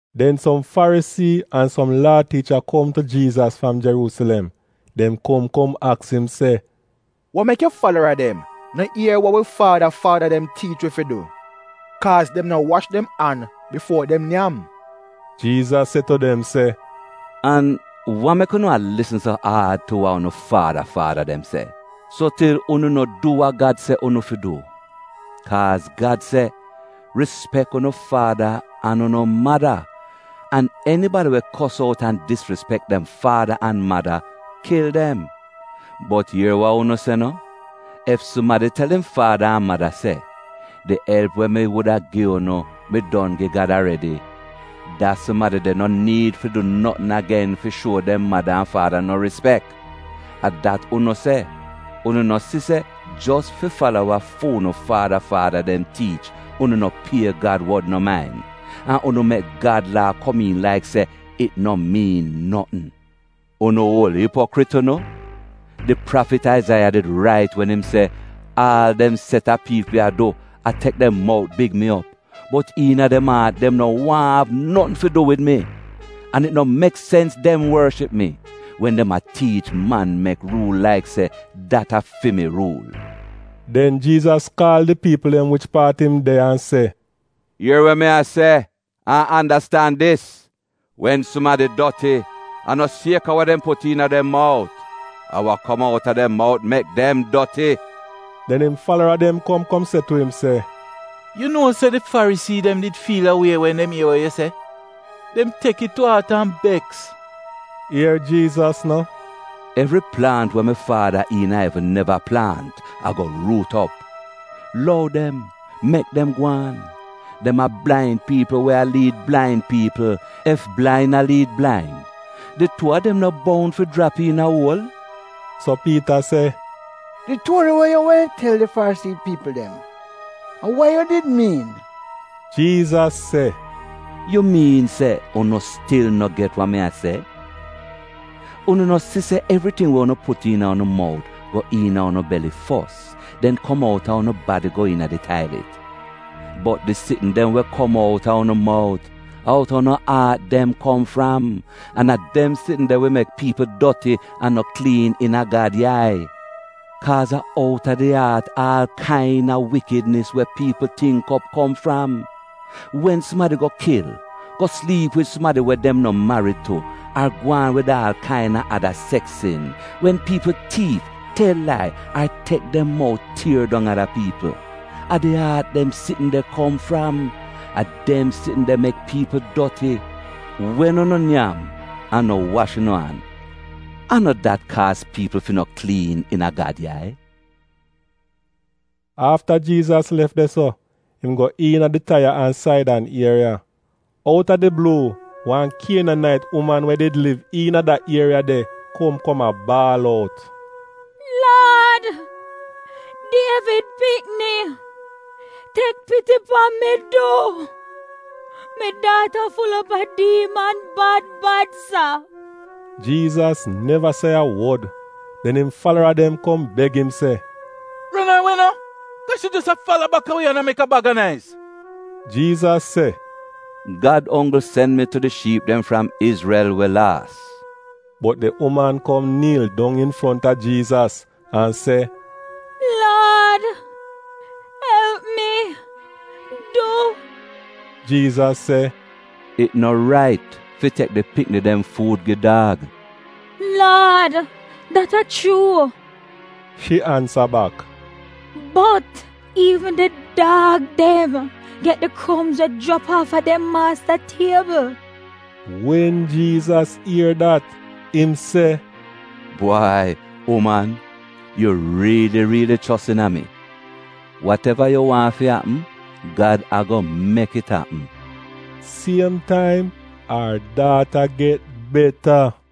Den som Farisii an som Laa tiicha kom tu Jiizas fram Jeruusilem. Dem kom kom aks im se, “Wa mek yu falara dem no ier wa wi faada faada dem tiich wi fi du? Kaaz dem no wash dem an bifuo dem nyam.” Jiizas se tu dem se, “An wa mek unu a lisn so aad tu wa unu faada faada dem se, so til unu no du wa Gad se unu fi du? Kaaz Gad se, ‘Rispek unu faada an unu mada’ an ‘Enibadi we kos out an disrispek dem faada an mada, kil dem.’ Bot ier wa unu se no, ‘Ef sumadi tel im faada an mada se, “Di elp we mi wuda gi unu, mi don gi Gad aredi,” da sumadi de no niid fi du notn agen fi shuo dem mada an faada no rispek’ — a dat unu se. Unu no si se, jos fi fala wa fu'unu faada faada dem tiich, unu no pie Gad wod no main, an unu mek Gad Laa komiin laik se it no miin notn. Unu oul ipokrit unu! Di prafit, Aizaiya, did rait wen im se, “‘Aal dem set a piipl ya du a tek dem mout big mi op, bot iina dem aat dem no waahn av notn fi du wid mi. An it no mek sens dem worship mi, wen dem a tiich man-mek ruul laik se dat a fi mi ruul.’” Den Jiizas kaal di piipl dem wich paat im de an se, “Ier wa mi a se an andastan dis: Wen sumadi doti, a no sieka wa dem put iina dem mout; a wa kom outa dem mout mek dem doti.” Den im falara dem kom kom se tu im se, “Yu nuo se di Farisii dem did fiil a wie wen dem ier wa yu se? Dem tek it tu aat an beks.” Ier Jiizas no, “Evri plaant we mi Faada iina evn neva plaant ago ruut op. Lou dem, mek dem gwaan. Dem a blain piipl we a liid blain piipl. Ef blain a liid blain, di tuu a dem no boun fi jrap iina uol?” So Piita se, “Di tuori we yu wehn tel di Farisii piipl dem, a wa yu did miin?” Jiizas se, “Yu miin se unu stil no get wa mi a se? Unu no si se evriting we unu put iina unu mout, go iina unu beli fos, den kom out a unu badi go iina di tailit? Bot di sitn dem we kom outa unu mout, a outa unu aat dem kom fram. An a dem sitn de wi mek piipl doti an no kliin iina Gad yai. Kaaz a outa di aat aal kaina wikidnis we piipl tingk op kom fram. Wen sumadi go kil, go sliip wid sumadi dem no marid tu ar gwaan wid aal kaina ada seks sin, wen piipl tiif, tel lai, ar tek dem mout tier dong ada piipl — a di aat dem sitn de kom fram. A dem sitn de mek piipl doti. Wen unu nyam an no wash unu an, an no dat kaaz piipl fi no kliin iina Gad yai.” Afta Jiizas lef de-so, im go iina di Taiya an Saidan ieriya. Out a di bluu wan Kienanait uman we did liv iina da ieriya de kom kom a baal out, “Laad, Dievid pikni, tek piti pan mi du! Mi daata ful op a diiman bad bad sa.” Jiizas neva se a wod. Den im falara dem kom beg im se, “Ron ar we no, kaa shi jos a fala baka wi an a mek wan baga naiz.” Jiizas se, “Gad onggl sen mi tu di shiip dem fram Izrel we laas.” Bot di uman kom niil dong infronta Jiizas an se, “Laad elp mi, du.” Jiizas se, “It no rait fi tek di pikni dem fuud gi daag.” “Laad, dat a chuu,” shi ansa bak, “bot iivn di daag dem get di kromz we jrap aafa dem maasta tiebl.” Wen Jiizas ier dat, im se, “Bwai uman, yu riili riili chos iina mi. Wateva yu waahn fi apm, Gad ago mek it apm.” Siem taim ar daata get beta.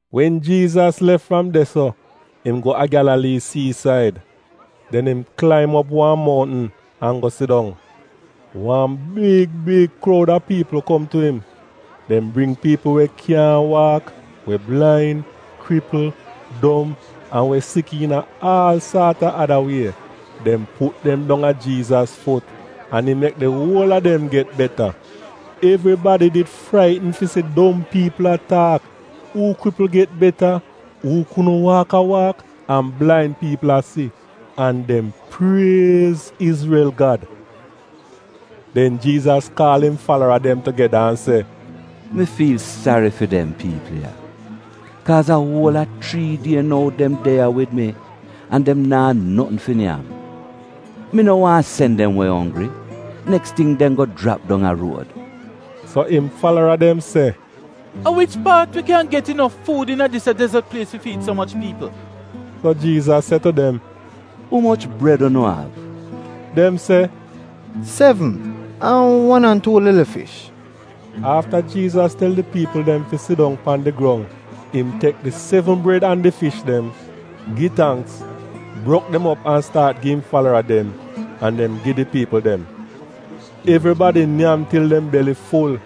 Wen Jiizas lef fram de-so, im go a Gyalalii siisaid. Den im klaim op wan mountn, an go sidong. Wan big big kroud a piipl kom tu im. Dem bring piipl we kyaahn waak, we blain, kripl, dom an we sik iina aal saat a ada wie. Dem put dem dong a Jiizas fut, an im mek di wol a dem get beta. Evribadi did fraitn fi si dom piipl a taak, uu kripl get beta, uu kudn waak a waak an blain piipl a si. An dem priez Izrel Gad. Den Jiizas kaal im falara dem tugeda an se, “Mi fiil sari fi dem piipl ya. Kaaz a uol a chrii die nou dem de ya wid mi, an dem naa notn fi nyam. Mi no waahn sen dem we onggri; neks ting dem go jrap dong a ruod.” So im falara dem se, “A wich paat wi kyan get inof fuud iina dis ya dezot plies fi fiid so moch piipl?” So Jiizas se tu dem, “Umoch bred unu av?” Dem se, “Sevn — an wan an tuu lili fish.” Afta Jiizas tel di piipl dem fi sidong pan di grong, im tek di sevn bred an di fish dem, gi tangks, brok dem op an staat gi im falara dem, an dem gi di piipl dem. Evribadi nyam til dem beli ful,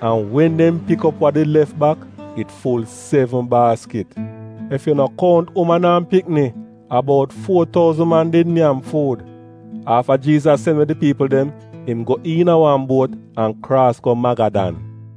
an wen dem pik op wa did lef bak, it ful sevn baaskit. Ef yu no kount uman an pikni, a bout fuo touzn man did nyam fuud. Afta Jiizas sen we di piipl dem, im go iina wan buot an kraas go Magadan.